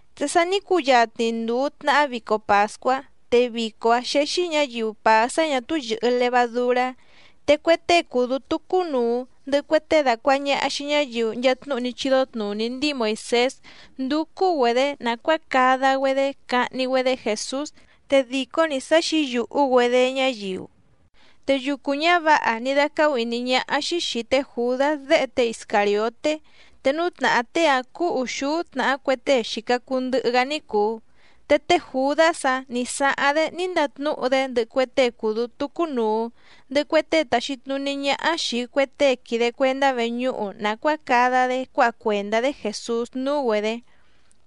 Te sa ní cuyatni nduu tnàhá vico pàscuá, te vico‑áⁿ xéxí ñǎyiu pàá sá ñà túú yɨ̀hɨ levadurá. Te cue tée cùu dútú cúnùu, ndɨhɨ cue tée dàcuaha ñaha xii ñáyiu nchaa tnúhu ní chídó tnùní ndíi Moìsés ndúcú‑güedě nàcuáa cada‑güedé cahni‑güedé Jèsús, te dìcó‑ni sá xǐyùhú‑güedé ñáyiu. Te yucu ñávǎha ní dácáhú ìní ñáhá‑xí xìi té Jùdás déhe té Iscàrioté, te núú tnàhá tée‑áⁿ cúú ùxúú tnàhá cue tée xìca cuu ndɨhɨ‑gá ní cùu. Te té Jùdás‑áⁿ nǐ sáháⁿ‑dé ní ndatnúhu‑dé ndɨhɨ cue tée cùu dútú cúnùu, ndɨhɨ cue tée tàxi tnuní ñáhá xìi cue tée quìde cuendá veñúhu nàcuáa cada‑dé cuáha cuèndá‑dé Jèsús núú‑güedě.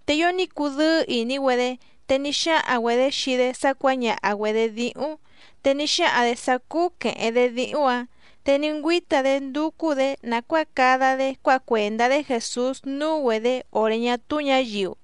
Te ío ní cudɨ́ɨ́ ìní‑güedé, te ní xáhaⁿ‑güedě xii‑dé sá cuǎñaha‑güedě díhúⁿ, te ní xáhaⁿ‑dě sá cúú quèheⁿ‑dé díhúⁿ‑ǎⁿ, te ní ngüíta‑dé ndúcú‑dě nàcuáa cada‑dé cuáha cuèndá‑dé Jèsús núú‑güedě òré ñá túú ñǎyiu.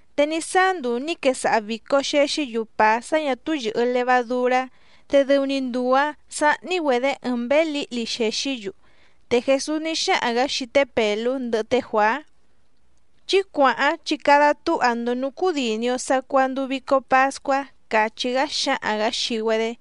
Te ní sáá nduu nǐ quesaha vìco xexí‑yu pàá sá ñà túú yɨ̀hɨ levadurá, te dɨu‑ni nduu‑ǎⁿ sáhní‑güedě ɨɨⁿ mběé lǐhli xèxí‑yu. Te Jèsús ní xáhaⁿ‑gǎ xii té Pèlú ndɨhɨ té Juàá: —Chí cuàháⁿ chi cada túha‑ndo nǔú cúdìni‑o sacuaa nduu vico pascuá —càchí‑gá xáhaⁿ‑gǎ xii‑güedé.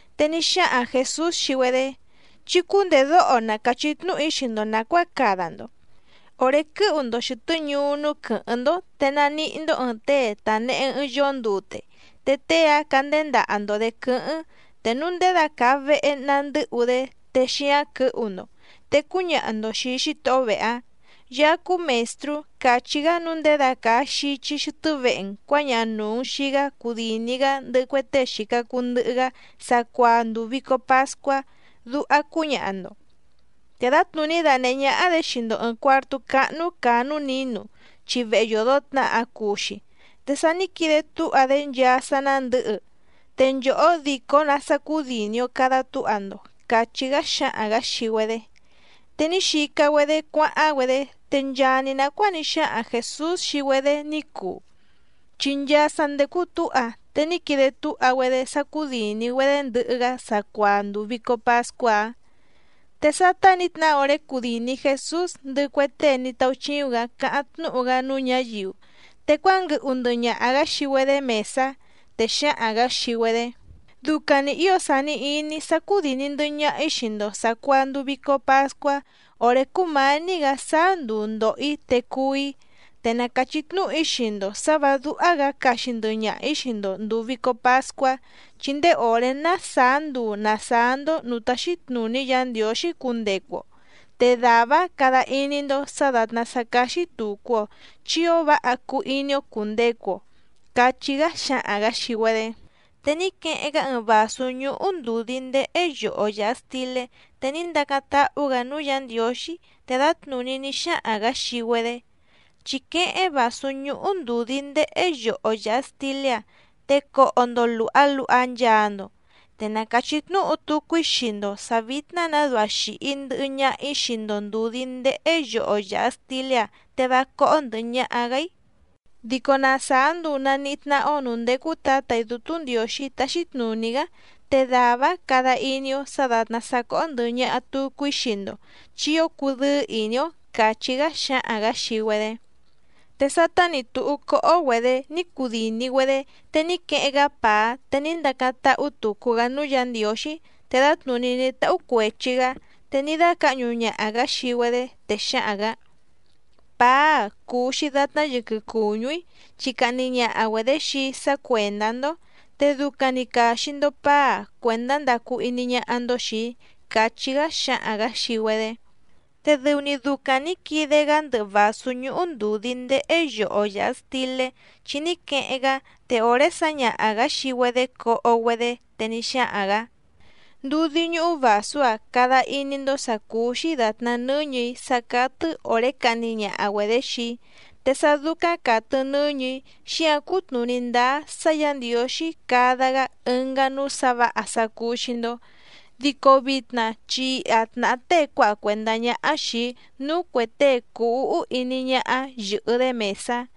Te ní xáhaⁿ Jèsús xii‑güedé: —Chí cúndèdóho na càchí tnúhu‑í xii‑ndo nàcuáa cada‑ndo. Òré quɨ́hu‑ndo xɨ̀tɨ́ ñuú núú quɨ̌hɨ́ⁿ‑ndó, te naníhí‑ndó ɨ̀ɨⁿ tée tànehe ɨɨⁿ yoó ndute, te tée‑áⁿ candéndaha‑ndo‑dě quɨ́hɨ́ⁿ, te núu ndědacàa vehe na ndɨ́hu‑dé te xíáⁿ quɨ̌hu‑ndo. Te cúñaha‑ndo xìi xítohó vehe‑áⁿ: “Yaá cúú Mèstrú càchí‑gá nǔu ndědacàa xichi xɨtɨ́ vehe‑n cuǎñaha nùu‑n xii‑gá cudìni‑gá ndɨhɨ cue tée xìca cuu ndɨhɨ‑gá sacuaa nduu vìco pascuá”, duha cúñaha‑ndo. Te dǎtnùní danèhé ñáhá‑dě xii‑ndo ɨ̀ɨⁿ cuartú cáhnú càa núú nǐnu, chi vehe yòdo tnaha cuu‑xi, te sa ní quide túha‑dé nchaa sá ná ndɨ̌hɨ, te nchòhó dìcó‑nǎ sá cúdìni‑o cada túha‑ndo —càchí‑gá xáhaⁿ‑gǎ xii‑güedé. Te ní xica‑güedé cuáháⁿ‑güedé, te nchaa‑ni nàcuáa ní xáhaⁿ Jèsús xii‑güedé ní cuu, chi nchaa sa ndècu túha, te ní quide túha‑güedé sá cúdìni‑güedé ndɨhɨ‑gá sacuaa nduu vìco pascuá‑áⁿ. Te sátá nǐ tnahá òré cudìni Jesús ndɨhɨ cue tée ní táúchíúⁿ‑gǎ cáháⁿ tnúhu‑gá núú ñǎyiu, te cuánguɨhu ndɨhɨ ñaha‑gǎ xii‑güedé mèsá. Te xáhaⁿ‑gǎ xii‑güedé: —¡Ducaⁿ‑ni ǐo sàni iní‑í sá cúdìni ndɨhɨ ñaha‑í xii‑ndo sàcuaa nduu vico pascuá òré cúmǎní‑gǎ sáá nduu ndòho‑í te cuú‑í! Te na càchí tnúhu‑í xii‑ndo sǎ vǎ dúhá‑gǎ caxi ndɨhɨ ñaha‑ǐ xii‑ndo ndùu vico pascuá, chi ndéé òré ná sàá nduu nàsáá‑ndó nǔú táxí tnùní Yǎ Ndiǒxí cundecu‑o, te dàvá‑áⁿ cada iní‑ndó sǎ dàtná sá cáxí tùcu‑o chi ío váha cuu iní‑ó cùndecu‑o —cachí‑gá xáhaⁿ‑gǎ xii‑güedé. Te ní queheⁿ‑gá ɨɨⁿ vàsú ñúhú ndùdí ndéhé yoho yàha stilé, te ní ndacáⁿ táhú‑gǎ núú Yǎ Ndiǒxí, te dǎtnùní ní xáhaⁿ‑gǎ xii‑güedé: —Chí quéhéⁿ vàsú ñúhú ndùdí ndéhé yoho yàha stilé‑a, te coho‑ndo lùha luha nchaa‑ndo. Te na càchí tnúhu tucu‑í xii‑ndo sǎ vítná‑nǎ duha xìhi ndɨhɨ ñaha‑í xii‑ndo ndùdí ndéhé yoho yàha stilé‑a te vá cóhó ndɨ̀hɨ ñaha‑gá‑í, dico na sàá nduu nàníhí tnáhá‑ó nǔú ndécú Tǎtà‑í Dútú Ndiǒxí táxí tnùní‑gá, te dàvá‑áⁿ cada iní‑ó sǎ dàtná sá cóhó ndɨ̀hɨ ñaha tucu‑í xii‑ndo, chi ío cudɨ́ɨ́ ìní‑ó —càchí‑gá xáhaⁿ‑gǎ xii‑güedé. Te sátá nǐ túhú cóhó‑güedě ní cudìni‑güedé, te ní queheⁿ‑gá pàá te ní ndacáⁿ táhú tùcu‑gá núú Yǎ Ndiǒxí, te dǎtnùní ní táhú cuèchi‑gá, te ní dácǎhñu ñaha‑gǎ xii‑güedé, te xáhaⁿ‑gǎ: —Pàá‑a cùu‑xi datná yɨquɨ cùñú‑í, chi cahni ñaha‑güedě xii‑í sá cuèndá‑ndó, te ducaⁿ‑ni càxi‑ndo paá‑a cuèndá ndacu iní ñáhá‑ndó xìi‑í —càchí‑gá xáhaⁿ‑gǎ xii‑güedé. Te dɨu‑ni ducaⁿ nǐ quide‑gá ndɨhɨ vàsú ñúhú ndùdí ndéhé yoho yàha stilé, chi ní queheⁿ‑gá te òré sǎñaha‑gǎ xii‑güedé coho‑güedé, te ní xáhaⁿ‑gǎ: —Ndudí ñúhú vàsú‑a cada iní‑ndó sǎ cúú‑xí dàtná nɨ́ñɨ̀‑í sá cátɨ́ òré cahni ñaha‑güedě xii‑í. Te sá dúcáⁿ càtɨ nɨ́ñɨ̀‑í xíǎⁿ cutnùní ndáá sá Yǎ Ndiǒxí cada‑gá ɨngá núú sǎ vǎha sá cúú‑xí‑ndó. ’Dico vitna chi iha tnàhá tée cuáha cuèndá ñáhá xìi‑í núú cuè tée cùu úhú iní ñáhá yɨ̀hɨ‑dé mèsá.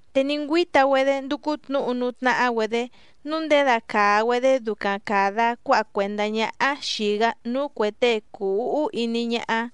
Te ní ngüíta‑güedé ndúcú tnǔhu núú tnáhá‑güedě nǔu nděda càa‑güedé ducaⁿ càda cuáha cuèndá ñáhá xìi‑gá núú cuè tée cùu úhú iní ñáhá.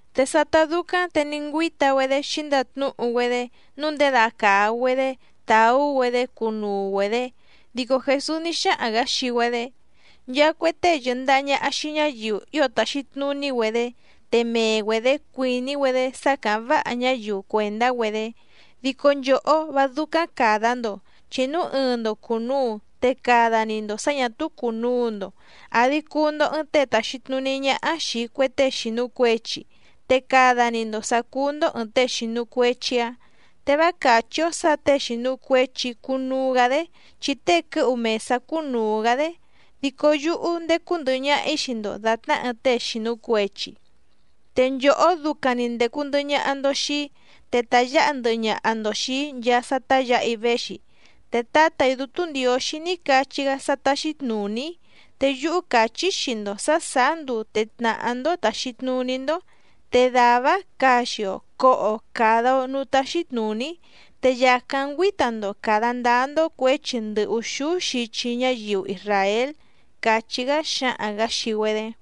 Te sátá dúcáⁿ te ní ngüíta‑güedé xǐndatnúhu‑güedé nǔu ndědacàa‑güedé tàú‑güedé cunuu‑güedě. Dico Jèsús ní xáhaⁿ‑gǎ xii‑güedé: —Nchaa cue tée yɨ̀ndaha ñaha xii ñáyiu ío tàxi tnuní‑güedé, te mee‑güedě cuìní‑güedé sá càháⁿ váha ñáyiu cuèndá‑güedé. Dico nchòhó vá dúcáⁿ càda‑ndo, chi núu ɨɨⁿ‑ndo cùnuu te cada‑ni‑ndo sǎ ñà túú cùnuu‑ndo, àdi cuu‑ndo ɨɨⁿ tée tàxi tnuní ñáhá xìi cue tée xìnu cuechi, te cada‑ni‑ndo sǎ cúú‑ndó ɨ̀ɨⁿ tée xìnu cuechi‑áⁿ. Te vá càchí‑ó sǎ těe xìnu cuechi cunuu‑gá‑dé, chi tée quɨ́hu mèsá cúnùu‑gá‑dé. Dico yúhú ndécú ndɨ̀hɨ ñaha‑í xii‑ndo dàtná ɨɨⁿ tée xìnu cuechi. ’Te nchòhó ducaⁿ‑ni ndècu ndɨhɨ ñaha‑ndo xii‑í, te tàyáha ndɨhɨ ñaha‑ndo xìi‑í nchaa sá táyǎha‑í véxi. Te Tǎtà‑í Dútú Ndiǒxí ní cachí‑gá sá táxí tnùní‑í, te yúhú càchí‑í xii‑ndo sǎ sàá nduu te tnàhá‑ndó tàxi tnuní‑ndó. Te dàvá‑áⁿ caxi‑o coho‑o càda‑o núú táxí tnùní‑í, te yàcáⁿ ngüíta‑ndo càda ndáá‑ndó cuěchi ndɨ ùxúú xichi ñáyiu isràél —càchí‑gá xáhaⁿ‑gǎ xii‑güedé.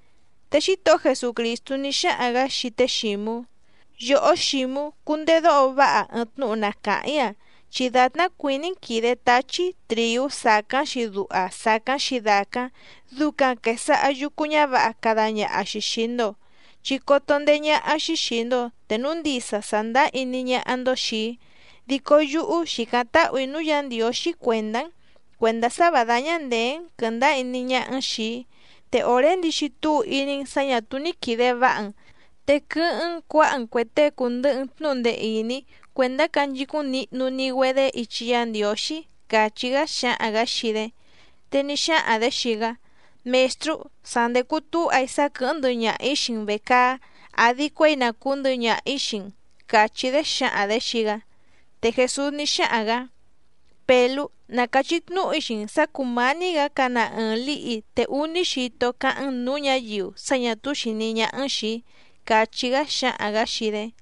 Te Xítohó Jesucrìstú ní xáhaⁿ‑gǎ xii té Xǐmú: —Yòhó Xǐmú, cundedóho váha ɨɨⁿ tnúhu na càháⁿ‑í‑a, chi dàtná cuìní‑n quìde táchí trìú sàcáⁿ‑xi duha sàcáⁿ‑xi dàcáⁿ, ducaⁿ quèsaha yucu ñávǎha cada ñaha‑xi xìi‑ndo. Chi coto ndeé ñáhá‑xí xìi‑ndo te núu ndisa sàndáá iní ñáhá‑ndó xìi‑í. Dico yúhú xìcáⁿ táhù‑í núú Yǎ Ndiǒxí cuèndá‑n, cuèndá sá vǎ dáñá ndèé‑n quɨ̀ndáá iní ñáhá‑n xìi‑í. Te òré ndixi túu iní‑n sǎ ñà túú ní quìde váha‑n, te quɨ́hɨ́ⁿ‑n cuǎha‑n cuè tée cùndɨhɨ‑n tnúhu ndee ìní cuèndá canchicúⁿ nihnu‑ni‑güedé ichi Yá Ndiǒxí —càchí‑gá xáhaⁿ‑gǎ xii‑dé. Te ní xáhaⁿ‑dě xii‑gá: —Mèstrú, sa ndècu túha‑í sá quɨ̀hɨ́ⁿ ndɨhɨ ñaha‑ǐ xii‑n vècaá, àdi cuéi na cùú ndɨhɨ ñaha‑ǐ xii‑n —càchí‑dé xǎhaⁿ‑dě xii‑gá. Te Jèsús ní xáhaⁿ‑gǎ: —Pèlú, na càchí tnúhu‑í xii‑n sǎ cùmání‑gǎ cana ɨɨⁿ lǐhi te úní xito cáháⁿ‑n nǔú ñǎyiu sá ñà túú xìní ñáhá‑n xìi‑í —càchí‑gá xáhaⁿ‑gǎ xii‑dé.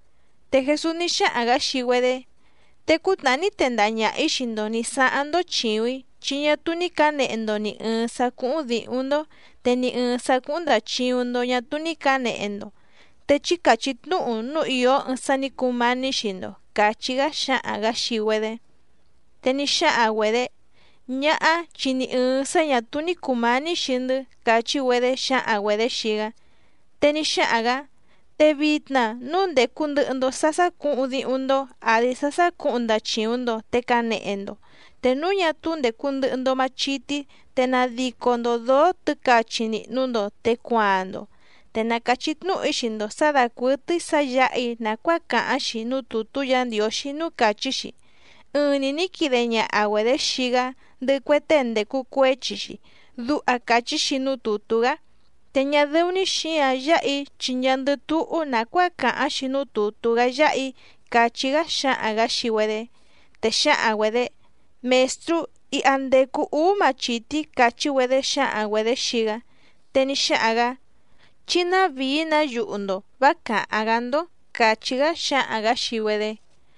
Te Jèsús ní xáhaⁿ‑gǎ xii‑güedé: —Te cútnàhá ní tendaha ñaha‑ǐ xii‑ndo nǐ sáháⁿ‑ndó chìuⁿ‑í, chi ñá túú ní cǎnehe‑ndo nì ɨɨⁿ sá cúhúⁿ dǐhúⁿ‑ndó, te ni ɨ̀ɨⁿ sá cúhúⁿ ndàchiuⁿ‑ndo ñá túú ní cǎnehe‑ndo. Te chí càchí tnúhu núu ìó ɨɨⁿ sá nǐ cumání xii‑ndo —càchí‑gá xáhaⁿ‑gǎ xii‑güedé. Te ní xáhaⁿ‑güedě: —Ñáhá, chi ni ɨ̀ɨⁿ sá ñà túú ní cùmání xii‑ndɨ́ —càchí‑güedé xǎhaⁿ‑güedě xii‑gá. Te ní xáhaⁿ‑gǎ: —Te vitna núu ndècu ndɨhɨ‑ndo sá sácǔhuⁿ díhúⁿ‑ndó, àdi sá sácǔhuⁿ ndachìuⁿ‑ndo te canehe‑ndo. Te núu ñá túú ndècu ndɨhɨ‑ndo machití, te nadico‑ndo dǒó tɨ̌cachi nìhnu‑ndo te cuaaⁿ‑ndo. Te na càchí tnúhu‑í xii‑ndo sǎ dàcuɨtɨ́í sǎ yǎha‑í nàcuáa càháⁿ‑xi núú tùtú Yǎ Ndiǒxí núú càchí‑xi: “Ɨɨⁿ‑ni nǐ quide ñaha‑güedě xii‑gá, ndɨhɨ cue tée ndècu cuéchi‑xi”, duha càchí‑xi núú tùtú‑gá. Te ñá dɨ́ú‑ní xǐǎⁿ yáha‑í chi nchaandɨ túhú nàcuáa càháⁿ‑xi núú tùtú‑gá yáha‑í —càchí‑gá xáhaⁿ‑gǎ xii‑güedé. Te xǎhaⁿ‑güedě: —Mèstrú, iha ndècu úú machìtí —càchí‑güedé xǎhaⁿ‑güedě xii‑gá. Te ní xáhaⁿ‑gǎ: —Chí návìí‑nǎ yuhu‑ndo, vá càháⁿ‑gá‑ndó —càchí‑gá xáhaⁿ‑gǎ xii‑güedé.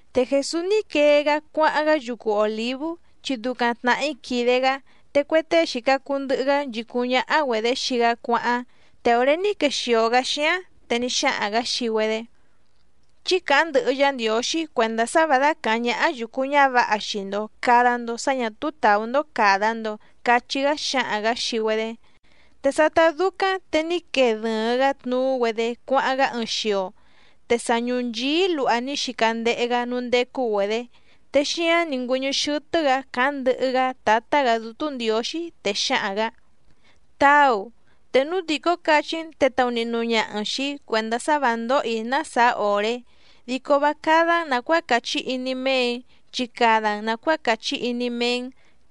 Te Jèsús ní quee‑gá cuáháⁿ‑gá yucu Òlívú, chi ducaⁿ tnàhí quìde‑gá. Te cue tée xìca cuu ndɨhɨ‑gá nchìcúⁿ ñáhá‑güedě xii‑gá cuáháⁿ. Te òré ní quexìo‑gá xíáⁿ, te ní xáhaⁿ‑gǎ xii‑güedé: —Chí càháⁿ ndɨhɨ Yá Ndiǒxí cuèndá sá vǎ dácàháⁿ ñáhá yùcu ñávǎha xii‑ndo càda‑ndo sá ñà túú tàú‑ndó càda‑ndo —cachí‑gá xáhaⁿ‑gǎ xii‑güedé. Te sátá dúcáⁿ te ní quee dɨ̀ɨⁿ‑gá tnuú‑güedé cuáháⁿ‑gá ɨɨⁿ xio, te sa ñùnchií luha ní xica ndehe‑gá núú ndécú‑güedě, te xíáⁿ nǐ ngüɨ́ñɨ́ xɨ́tɨ́‑gǎ càháⁿ ndɨhɨ‑gá Tǎtá‑gǎ Dútú Ndiǒxí. Te xáhaⁿ‑gǎ: —Táu, te núu dìcó cachí‑n te taunihnu ñaha‑n xìi‑í cuèndá sá vǎ ndóhò‑í ná sàá òré, dico vá cádá‑n nàcuáa càchí iní méè‑í, chi cada‑n nàcuáa càchí iní méé‑n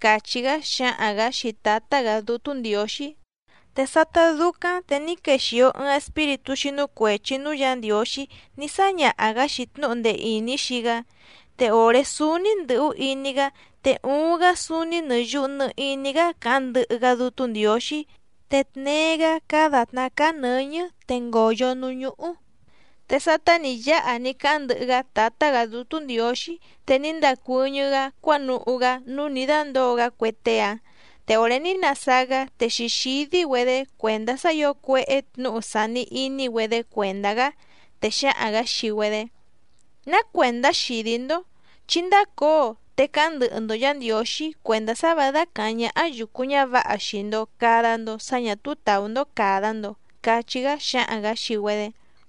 —càchí‑gá xáhaⁿ‑gǎ xii Tǎtá‑gǎ Dútú Ndiǒxí. Te sátá dúcáⁿ te ní quexìo ɨɨⁿ espíritú xínú cuèchi núú Yǎ Ndiǒxí ní sáñaha‑gǎ‑xi tnúhu ndee ìní xii‑gá. Te òré súúní ndɨ̀hú iní‑gá, te uuⁿ‑gá súúní nɨ̀ yuhu nɨ iní‑gá càháⁿ ndɨhɨ‑gá Dútú Ndiǒxí, te tnéé‑gǎ cáá dàtná cáá nɨ̌ñɨ́ te ngóyó nǔú ñúhú. Te sátá nǐ yáha ní cáháⁿ ndɨhɨ‑gá Tǎtá‑gǎ Dútú Ndiǒxí, te ní ndacuɨ́ñɨ́‑gá cuánuhú‑gá núú nǐ dándǒo‑gá cue tée‑áⁿ, te òré ní nasáá‑gá te xǐxídí‑güedé cuèndá sá ǐo cuéhé tnǔhu sàni iní‑güedé cuèndá‑gá. Te xáhaⁿ‑gǎ xii‑güedé: —¿Ná cuèndá xìdí‑ndó? Chí ndácǒo, te cáháⁿ ndɨhɨ‑ndo Yǎ Ndiǒxí cuèndá sá vǎ dácàháⁿ ñáhá yùcu ñávǎha xii‑ndo càda‑ndo sá ñà túú tàú‑ndó càda‑ndo —cachí‑gá xáhaⁿ‑gǎ xii‑güedé.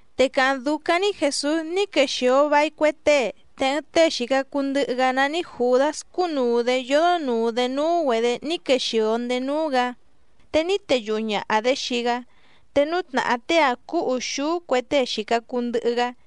Te càháⁿ dúcáⁿ‑ní Jèsús ní quexìo vai cue tée, te ɨɨⁿ tée xìca cuu ndɨhɨ‑gá nání Jùdás cúnùu‑dé yódó nùu‑dé núú‑güedě ní quexìo ndéé núú‑gǎ, te ní teyuhu ñàha‑dé xii‑gá, te núú tnàhá tée‑áⁿ cúú ùxúú cue tée xìca cuu ndɨhɨ‑gá.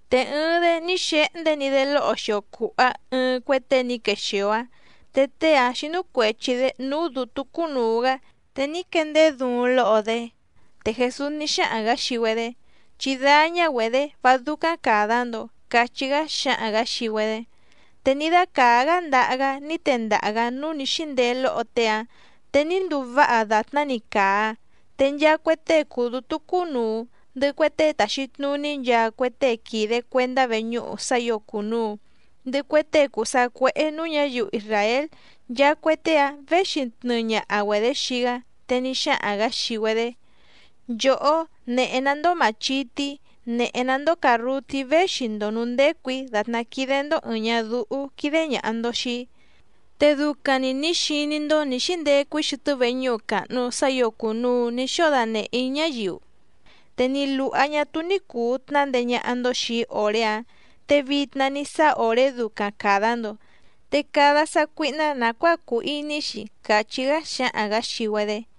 Te ɨɨⁿ‑dé ní xehndé‑ni‑dé lóho xio cùha ɨɨⁿ cue tée ní quexìo‑áⁿ, te tée‑áⁿ xínú cuèchi‑dé núú dǔtú cúnùu‑gá, te ní quendeé duuⁿ lóho‑dé. Te Jèsús ní xáhaⁿ‑gǎ xii‑güedé: —Chí dáñá‑güedě, vá dúcáⁿ càda‑ndo —cachí‑gá xáhaⁿ‑gǎ xii‑güedé. Te ní dácàá‑gá ndaha‑gá ní tendaha‑gǎ núú nǐ xíndeé lóho tée‑áⁿ, te ní nduu váha dàtná‑ni càa. Te nchaa cue tée cùu dútú cúnùu, ndɨhɨ cue tée tàxi tnuní nchaa cue tée quìde cuendá veñúhu sá ǐo cùnuu, ndɨhɨ cue tée cùu sacuéhé nǔú ñǎyiu isràél, nchaa cue tée‑áⁿ věxi tnɨɨ ñaha‑güedě xii‑gá, te ní xáhaⁿ‑gǎ xii‑güedé: —Nchòhó, nèhe‑ná‑ndó màchití, nèhe‑ná‑ndó càrrutí véxi‑ndo nǔú ndécù‑í, dàtná quídé‑ndó ɨ̀ɨⁿ ñadúhú quídé ñàha‑ndo xii‑í. Te ducaⁿ‑ni nǐ xiní‑ndó nǐ xíndecu‑í xɨtɨ́ veñúhu càhnu sá ǐo cùnuu ní xóo danèhé‑í ñáyiu, te ni lùha ñá túú ní cùu tnándeé ñáhá‑ndó xìi‑í òré‑áⁿ, te vitna ní sáá òré ducaⁿ càda‑ndo, te cada sácuíhná nàcuáa cùu iní‑xi —càchí‑gá xáhaⁿ‑gǎ xii‑güedé.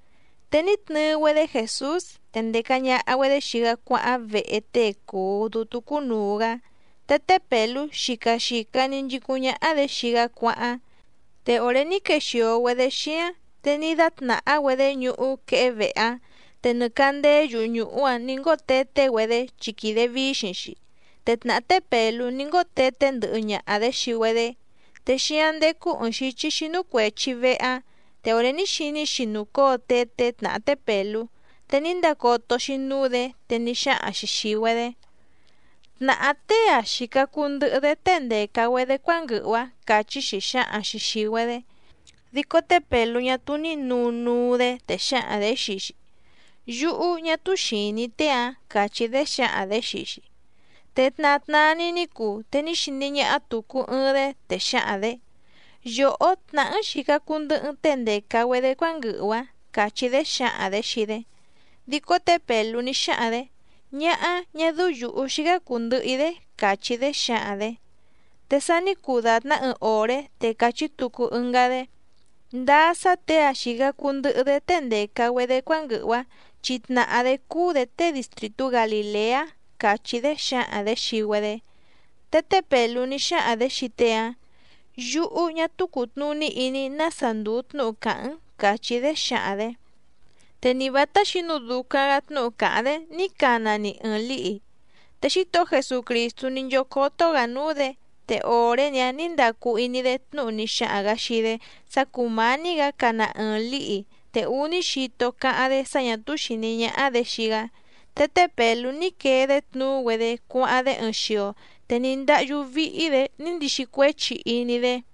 Te ní tnɨɨ‑güedé Jèsús, te ndèca ñaha‑güedé xii‑gá cuáháⁿ vehe tée cùu dútú cúnùu‑gá, te té Pèlú xica xìca‑ni nchicúⁿ ñáhá‑dě xii‑gá cuáháⁿ. Te òré ní quexìo‑güedé xíáⁿ te ní dátnàhá‑güedé ñuhú quehé vehe‑áⁿ, te nɨ càndéé yuhu nùhú‑áⁿ nǐ ngóo teté‑güedé, chi quìde víxiⁿ‑xi, te tnàhá té Pèlú ní ngóo teté ndɨhɨ ñaha‑dě xii‑güedé. Te xíáⁿ ndécú ɨ̀ɨⁿ xíchí xínú cuèchi vehe‑áⁿ, te òré ní xiní‑xi nùcóo teté tnàhá té Pèlú, te ní ndacoto‑xi núú‑dě, te ní xáhaⁿ‑xi xìi‑güedé: —Tnàhá tée‑a xìca cuu ndɨhɨ‑dé tée ndèca‑güedé cuánguɨhu‑ǎⁿ —càchí‑xi xǎhaⁿ‑xi xìi‑güedé. Dico té Pèlú ñá túú ní nǔnuu‑dé, te xǎhaⁿ‑dě xii‑xi: —Yúhú ñá túú xìní‑í tée‑ǎⁿ —càchí‑dé xǎhaⁿ‑dě xii‑xi. Te tna tnaa‑ni ní cuu, te ní xiní ñáhá tùcu ɨɨⁿ‑dé, te xǎhaⁿ‑dě: —Yòhó tnàhá‑n xìca cuu ndɨhɨ‑n tée ndèca‑güedé cuánguɨhu‑ǎⁿ —càchí‑dé xǎhaⁿ‑dě xii‑dé. Dico té Pèlú ní xáhaⁿ‑dě: —Ñáhá, ñá dɨ́ú yǔhú xícá cùu ndɨhɨ‑í‑dé —càchí‑dé xǎhaⁿ‑dě. Te sa ní cuu dàtná ɨɨⁿ òré te càchí tucu ɨngá‑dé: —Ndáá sá těe‑a xìca cuu ndɨhɨ‑dé tée ndèca‑güedé cuánguɨhu‑ǎⁿ, chi tnàhá‑dé cúú‑dě tée distrìtú Galìleá —càchí‑dé xǎhaⁿ‑dě xii‑güedé. Te té Pèlú ní xáhaⁿ‑dě xii tée‑áⁿ: —Yúhú ñá túú cùtnuní iní‑í nása ndùu tnúhu càháⁿ‑n —càchí‑dé xǎhaⁿ‑dě. Te ni vǎtá xǐnu ducaⁿ‑gǎ tnúhu càháⁿ‑dé ní cana‑ni ɨɨⁿ lǐhi. Te Xítohó Jesucrìstú ní nchócótó‑gǎ núú‑dě, te òré‑ni‑áⁿ nǐ ndacu iní‑dé tnúhu ní xáhaⁿ‑gǎ xii‑dé sá cùmání‑gǎ cana ɨɨⁿ lǐhi, te úní xito cáháⁿ‑dé sá ñà túú xìní ñáhá‑dě xii‑gá. Te té Pèlú ní quee‑dé tnuú‑güedé cuáháⁿ‑dé ɨɨⁿ xio, te ní ndáhyú víhí‑dě ní ndixi cuéchi iní‑dé.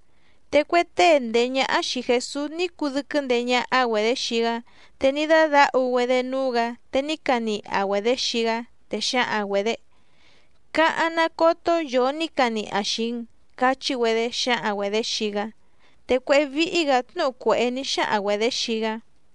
Te cue tée ndèé ñáhá xìi Jesús ní cudɨ́quɨ́ ndeé ñáhá‑güedě xii‑gá, te ní dádǎhu‑güedé núú‑gǎ, te ní caniha‑güedě xii‑gá, te xǎhaⁿ‑güedě: —¡Cáháⁿ ná cótó yòo ní caniha xìi‑n! —cachí‑güedé xǎhaⁿ‑güedě xii‑gá. Te cuéhé víhí‑gǎ tnúhu cuèhé ní xáhaⁿ‑güedě xii‑gá.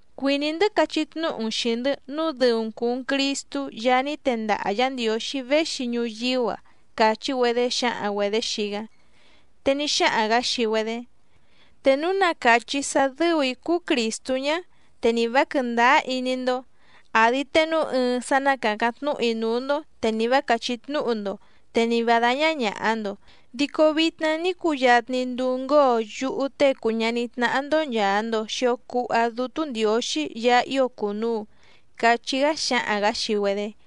—Cuìní‑ndɨ́ cachí tnúhu‑n xìi‑ndɨ́ nǔu dɨu‑n cùu‑n Cristú Yaá ní tendaha Yǎ Ndiǒxí véxi ñuyíú‑a —càchí‑güedé xǎhaⁿ‑güedě xii‑gá. Te ní xáhaⁿ‑gǎ xii‑güedé: —Te núu na càchí‑í sá dɨ́ù‑í cúú Crìstú ñá, te nì vá quɨ̀ndáá iní‑ndó, àdi te núu ɨɨⁿ sá ná càcáⁿ tnúhu‑í núú‑ndó, te nì vá càchí tnúhu‑ndo, te ni vǎ dáñá ñàha‑ndo. Dico vitna ní cuyatni nduu ngóo yúhú Tée cùu ñaní tnáhá‑ndó nchàa‑ndo xio cuha Dútú Ndiǒxí Yaá ío cùnuu —cachí‑gá xáhaⁿ‑gǎ xii‑güedé.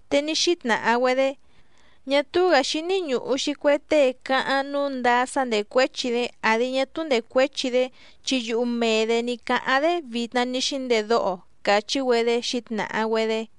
Te ní xítnàha‑güedé: —Ñá túú‑gǎ xíní ñùhu‑xi cue tée cáháⁿ nǔu ndáá sá ndècuéchi‑dé àdi ñá túú ndècuéchi‑dé chi yuhu mee‑dě ní cáháⁿ‑dé vitna ní xíndedóho‑o —càchí‑güedé xǐtnàha‑güedé.